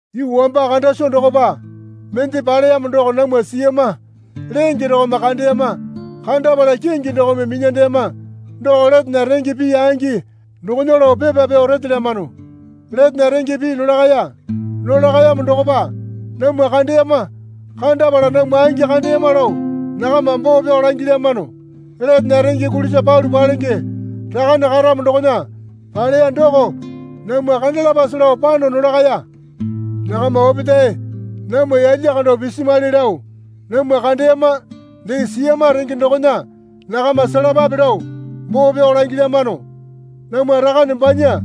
Yuu wamba kanda soo dokopa mende paleyamo doko namwa siyama lenge dokome kandeyama kandapala kingi dokome minyandeyama doko letena renge pii angi dokona lao pepa pyao retelyamano. Letena renge pii nolakaya. Nolakayamo dokopa namwa kandeyama. Kandapala namwa angi kandeyama lao nakama boo pyao langilyamano. Letena renge kulisa palu palenge Rakane karamo dokona paleya doko namwa kandalapase lao pano nolakaya. Nakama opetae namwa yalya kando pisimwali lao namwa kandeyama dee siyama renge dokona nakama selapape lao boo pyao langilyamano. Namwa Rakane banya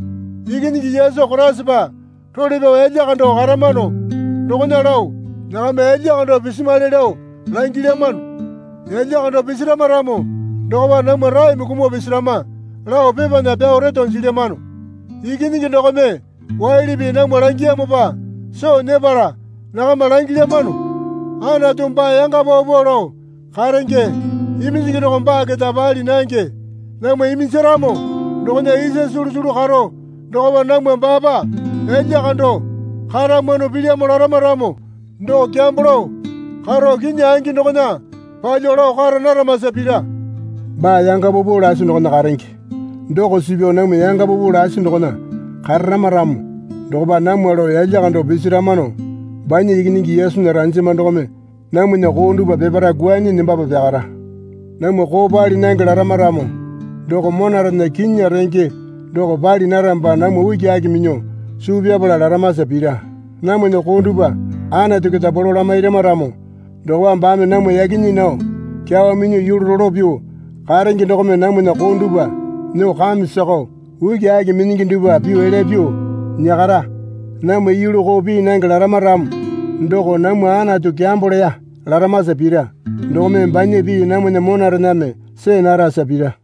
Ikinyingi Yesu Koraisapa role pyao yalya kando karamano dokona lao nakama yalya kando pisimwali lao langilyamano. Yalya kando pisirama ramo dokopa namwa raeme kumuo pisirama lao pepana pyao reto jilyamano. Ikinyingi dokome waili pii namwa langiyamopa soo nyepala nakama langilyamano. Anatu baa yanga paupau lao karenge. Iminjingi doko baa keta pali nange. Namwa iminjaramo dokona isa sulusulu karo dokopa namwa baapa yalya kando karamwano pilyamo larama ramo doko kyambo lao karo kinyi angi dokona palyuo lao kara naramasa pira. Baa yanga paupau lasi dokona karenge doko suu pyao namwa yanga paupau lasi dokona kararama ramo dokopa namwa lao yalya kando pisiramano banya Ikinyingi Yesunya ranjama dokome namwana koo dupwa peparae kwuanyi nembapa pyakara. Namwa koo pali nange larama ramo doko monarena kinyinya renge doko pali naramopa namwa ukiaki minyuo suu pyapala laramasa pira. Namwana koo dupwa Anatu keta polo lamairama ramo dokopa baame namwa yaki nyii nao kyawa minyuo yulu rolo pyuo karenge dokome namwana koo dupwa nyuo kame sakao ukiaki minyingi dupwa pyuo elya pyuo nyakara. Namwa yulu koo pii nange larama ramo doko namwa Anatu kyambo leya laramasa pira. Dokome banya pii namwana monarename see narasa pira.